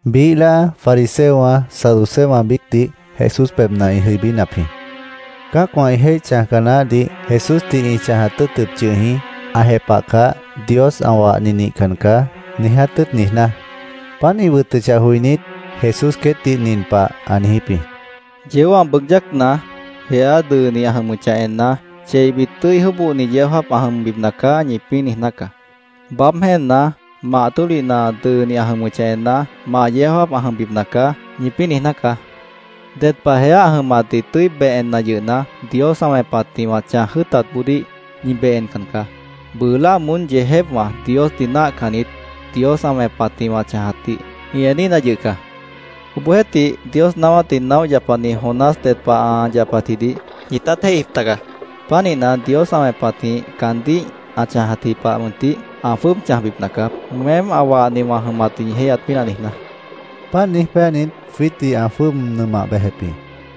Biíh láa fariseowã, saduceowã biícdih Jesús pebhna ĩ jʉibínap jĩ. Cã́acwã ĩ jéih chãjca naáhdih Jesúsdih ĩ chãjat tʉ́ʉtʉp yʉh jĩ, ã jepahcah, “Dios ã wahni nihcan caá”, niiját tʉ́ʉt niijná. Páant ĩ wʉtʉchah joinít, Jesús queétdih nin pah ã niijíp jĩ: “Yeó ã bʉʉg yácna, jeá dʉʉni ã jʉmʉchah enna, ‘Cheibit tʉ́i jóbohni yeó jáap ã jʉmbipna caá’, ñipĩ́ niijná caá. Baáb jéenna, mah tólihna dʉʉni ã jʉmʉchah enna, ‘Mah yeó jáap ã jʉmbipna caá’, ñipĩ́ niijná caá. Ded pah jeá ã jʉmatdih tʉ́i beh enna yʉhna, Dios ã wẽpatjĩh wã chãj jʉ́ʉtatboodíh ñi beh encan caá. Bʉʉ láa moón yeejépwã, Diosdih náahcannit, Dios ã wẽpatjĩh wã chãjatdih ĩ eníhna yʉh caá.Obohjeéhtih, Dios naáwátdih naóh yapani Jonás ded pah ã yapatjidih ñitát jéihjip taga.Pánihna, Dios ã wẽpatjĩh caandíh ã chãjatji pahjeh mʉntih ã jwʉ́ʉb chãjbipna caá, weém ã wahni wã jʉmatdih ñi jéihyat pínah niijná”, ã niijíp jĩ. Páant niíj péanit, jwiítdih ã jwʉ́ʉb nʉmah bejep jĩ.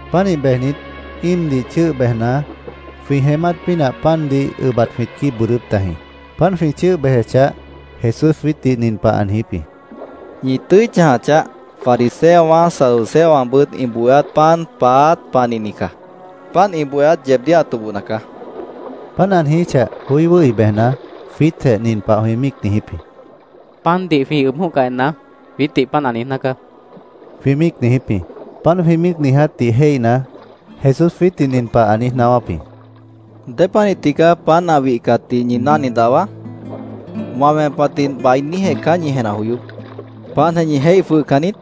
Pánih bejnit, íimdih chʉ́ʉh bejna, jwĩ jeémát pínah pandih ʉbat jwĩt quíib bʉʉdʉ́p tajĩ. Páant jwĩ chʉ́ʉh bejechah, Jesús jwiítdih nin pah ã niijíp jĩ: —¡Ñi tʉ́i chãja chaáh! Fariseowã, saduceowãbʉt ĩ bohéát pan paáát panihni caá. Páant ĩ bohéát yeebdíh ã tobohna caá, ã niijíp jĩ. Páant ã niijíchah, joí wʉ́hi bejna, jwiítjeh nin pah jwĩ míic niijíp jĩ: —Pandih jwĩ ʉb jʉ̃óhcah enna, jwiítdih páant ã niijná caá, jwĩ míic niijíp jĩ. Páant jwĩ míic niijátdih jéihna, Jesús jwiítdih nin pah ã niíj naáwáp jĩ: —¿Dépanih tigaá pan ã wihcatdih ñi náhni dahwa? ¡Wã wẽpatdih bainíjeh caá ñi jenah joyóp! ¿Páantjeh ñi jéih jwʉhcan niít?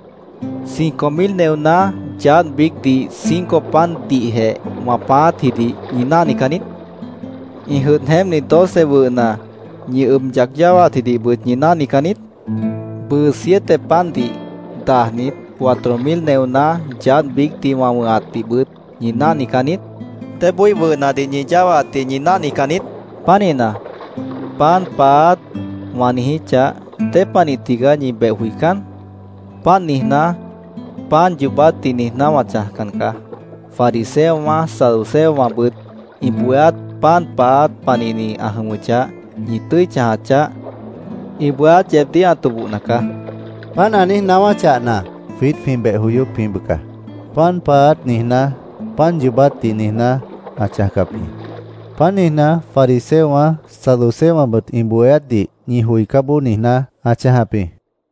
¿Cinco mil neoná yaádh biícdih cinco pandihjeh wã pãáátjidih ñi náhnican niít? ¿Ĩ jʉdh jeémpni doce wʉhna ñi ʉb yac yáwaatjidihbʉt ñi náhnican niít? ¿Bʉʉ siete pandih dajnit, cuatro mil neoná yaádh biícdih wã wʉ̃hatdihbʉt ñi náhnican niít? ¿Débói wʉhnadih ñi yáwaatdih ñi náhnican niít? Pánihna, ‘pan paáát’, wã niijíchah, ¿dépanih tigaá ñi beh joicán? Páant niijná, pan yoobátdih niijná wã chãjcan caá. Fariseowã, saduceowãbʉt ĩ bohéát pan paáát panihni ã jʉmʉchah, ñi tʉ́i chãja chaáh. Ĩ bohéát yeebdíh ã tobohna caá, ã niijíp jĩ. Páant ã niíj naáwáchahna, jwiít jwĩ beh joyóp jĩ bʉca. “Pan paáát”, niijná, pan yoobátdih niijná ã chãjcap jĩ. Páant niijná, “fariseowã, saduceowãbʉt ĩ bohéátdih ñi joicá bojoó”, niijná ã chãjap jĩ.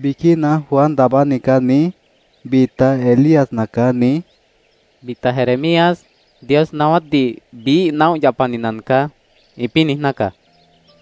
—Biquína ‘Juan Daabáni nacaá’, niíj, bita ‘Elías nacaá’, niíj, bita ‘Jeremías, Dios naáwátdih biíh naóh yapani nacaá’, ĩpĩ́ niijná caá, caandíh jwĩ niíj jepahap jĩ.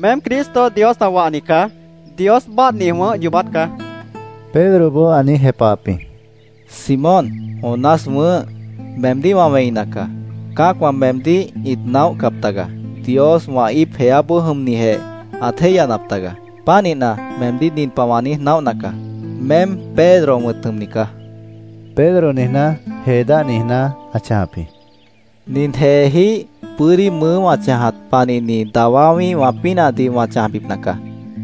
—Meém Cristo, Dios ã wahni caá. Dios báadhni wʉ̃ʉ́h yoobát caá, Pedroboó ã niíj jepahap jĩ. —Simón, Jonás wʉ̃ʉ́h, meemdíh wã wẽina caá. Cã́acwã meemdíh ĩt naóhcap taga. Dios wã íip, jeáboó jʉmnijeh ãt jéihyanap taga. Pánihna, meemdíh nin pah wã niíj naóhna caá: Meém Pedro wʉ̃t jʉmni caá. (Pedro niijná, jee dáh niijná ã chãjap jĩ.) Nin jeejíh bʉ́dí mʉʉ́ wã chãjat panihni dawá wĩ́ihwã pínahdih wã chãjbipna caá.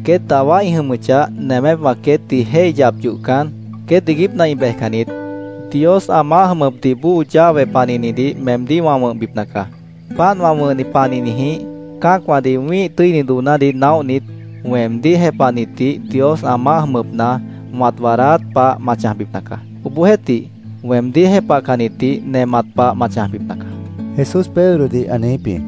Queét dawá ĩ jʉmʉchah, nemépwã queétdih jéih yap yohcan, queét iiguípna ĩ bejcan niít. Dios ã maáh jʉmʉpdih bóo llave panihnidih meemdíh wã wʉ̃hbipna caá. Páant wã wʉ̃hni panihnijĩh, cã́acwãdih wĩ́ih tʉ́ini doonádih naóhnit, weemdíh jepahnitdih Dios ã maáh jʉmʉpna wãt waadáát pah ma chãjbipna caá. Obohjeéhtih, weemdíh jepahcannitdih nemat pah ma chãjbipna caá, Jesús Pedrodih ã niijíp jĩ.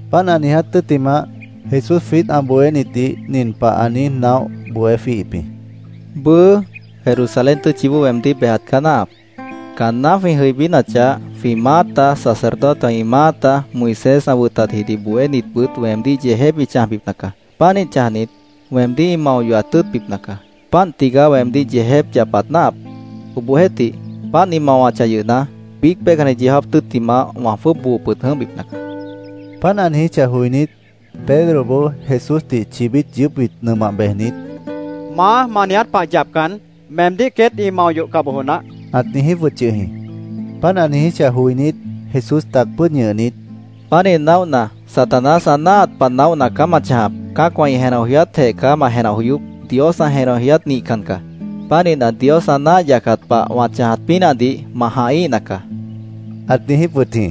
Páant ã niiját tʉ́ttimah, Jesús jwiít ã bohénitdih nin pah ã niíj naóh bohé jwíihip jĩ: —Bʉʉ, Jerusalén tʉ́tchiboó weemdíh bejat caá náahap. Caanná jwĩ jʉibínachah, jwĩ maáta, sacerdotewã ĩ maáta, Moisés ã wʉtatjidih bohénitbʉt weemdíh yeejép ĩ chãjbipna caá. Pánih chãjnit, weemdíh ĩ mao yohat tʉ́ʉtbipna caá. Páant tigaá weemdíh yeejép yapat náahap. Obohjeéhtih, páant ĩ mawachah yʉhna, biíc peihcanni yeó jáap tʉ́ttimah wã jwʉ́ʉb boo pʉd jʉ̃óhbipna caá, jwiítdih ã niijíp jĩ. Páant ã niijíchah joinít, Pedroboó Jesúsdih chibít yʉʉ́pbit nʉmah bejnit, —¡Maá, ma niiját pah yapcan, meemdíh queét ĩ mao yohca bojo naáh! ãt niijíp wʉt yʉh jĩ. Páant ã niijíchah joinít, Jesús tac pʉ́ʉd ñʉhnit, —Pánih naóhna, Satanás ã náahat pah naóhna caá ma chãjap. Cã́acwã ĩ jenah joyátjeh caá ma jenah joyóp. Dios ã jenah joyát nihcan caá. Pánihna, Dios ã náah yacat pah wã chãjat pínahdih ma jãhíhna caá, ãt niijíp wʉt jĩ.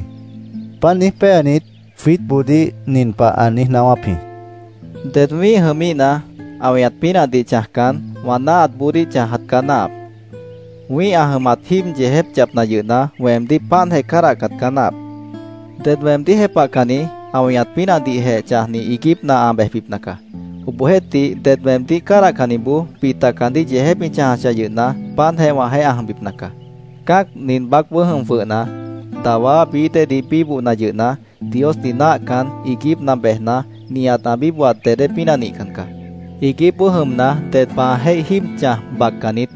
Páant niíj péanit, jwiítboodíh nin pah ã niíj naáwáp jĩ: —Ded wĩ́ih jʉmíhna, ã weñat pínahdih chãjcan, wã náahatboodíh chãjat caá náahap. Wĩ́ih ã jʉmat jíib yeejép yapna yʉhna, weemdíh páantjeh cádahcat caá náahap. Ded weemdíh jepahcanni, ã weñat pínahdihjeh chãjni, iiguípna ã bejbipna caá. Obohjeéhtih, ded weemdíh cádahcanniboó bita caandíh yeejép ĩ chãjachah yʉhna, páantjeh wãjeéh ã jʉmbipna caá. Cã́ac nin baácboó jʉm jwʉhna, dawá bií déedih bíbohna yʉhna, Diosdih náahcan, iiguípna bejna, nihat ã bíbohat dedé pínah nihcan caá. Iiguípboó jʉmna, ded pah ã jéih jíib chãj baccan niít.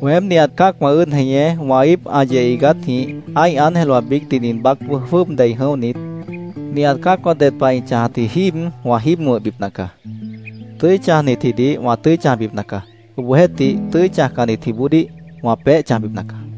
Weém nihat cã́acwã ʉ́ʉd jeñé wã íip ã yeh iigátjĩh ã́ih ángelwã biícdih nin baácboó jwʉ́ʉb dei jʉ̃óhnit,nihat cã́acwã ded pah ĩ chãjatji jíib wã jíib wʉ̃hbipna caá. Tʉ́i chãjnitjidih wã tʉ́i chãjbipna caá. Obohjeéhtih, tʉ́i chãjcannitjiboodíh wã peéh chãjbipna caá.